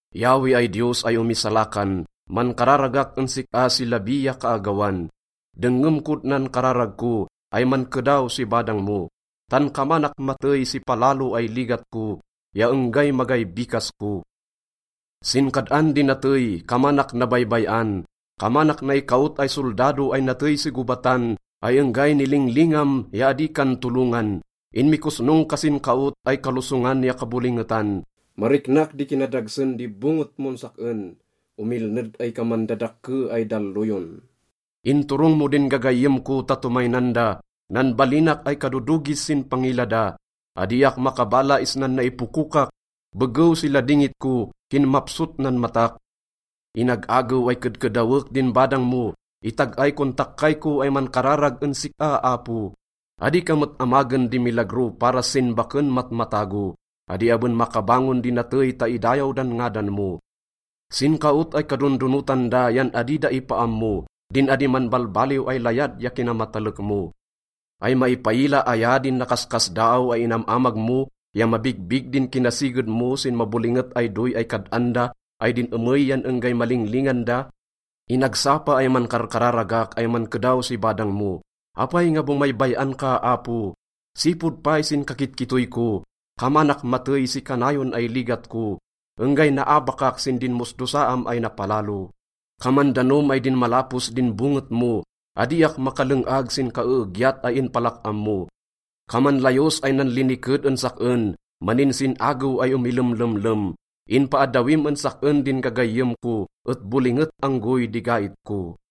Yahweh ay Diyos ay omisalakan, mankararagak en sik-a si labi ya kaagawan. Dengngem kod nan kararag ko ay mankedaw si badang mo, tan kamanak matey si palalo ay ligat ko ya enggay magay bikas ko. Sin kad-an di natey, kamanak nabaybay-an, kamanak naikaot ay soldado ay natey si gobatan ay enggay nilinglingam ya adi kan tolongan. Inmikosnong ka sin kaot ay kalosongan ya kabolingetan. Mariknak di kinadagsen di bonget mon sak-en, omilned ay kaman dadakke ay dalloyon. Inturong mo din gagayyem ko ta tomaynan da, nanbalinak ay kadodogis sin pangila da. Adiak makabala isnan naipokokak, begew si ladingit ko, kinmapsot nan matak. Inag-agew ay kedkedawek din badang mo, itag-ay kon takkay ko ay mankararag en sik-a, Apo. Adi ka met amagen di milagro para sin baken matmatago, adi aben makabangon di natey ta idayaw dan ngadan mo. Sin kaot ay kadondonotan da yan adi da ipaammo din adi manbalbaliw ay layad ya kinamatalek mo. Ay maipaila aya din nakaskasdaaw ay inam-amag mo ya mabigbig din kinasiged mo sin mabolinget ay doy ay kad-an da ay din emey yan enggay malinglingan da? Inagsapa ay mankarkararagak ay mankedaw si badang mo. Apay nga bomaybay-an ka, Apo? Sipod pay sin kakitkittoy ko, kamanak matey si kanayon ay ligat ko, enggay naabakak sin dinmosdosaam ay napalalo. Kaman danom ay dinmalapos din bonget mo, adiak makaleng-ag sin kaeegyat ay inpalak-am mo. Kaman layos ay nanliniked en sak-en, maninsin-agew ay omilemlemlem. Inpaaddawim en sak-en din gagayyem ko, et bolinget anggoy di gait ko.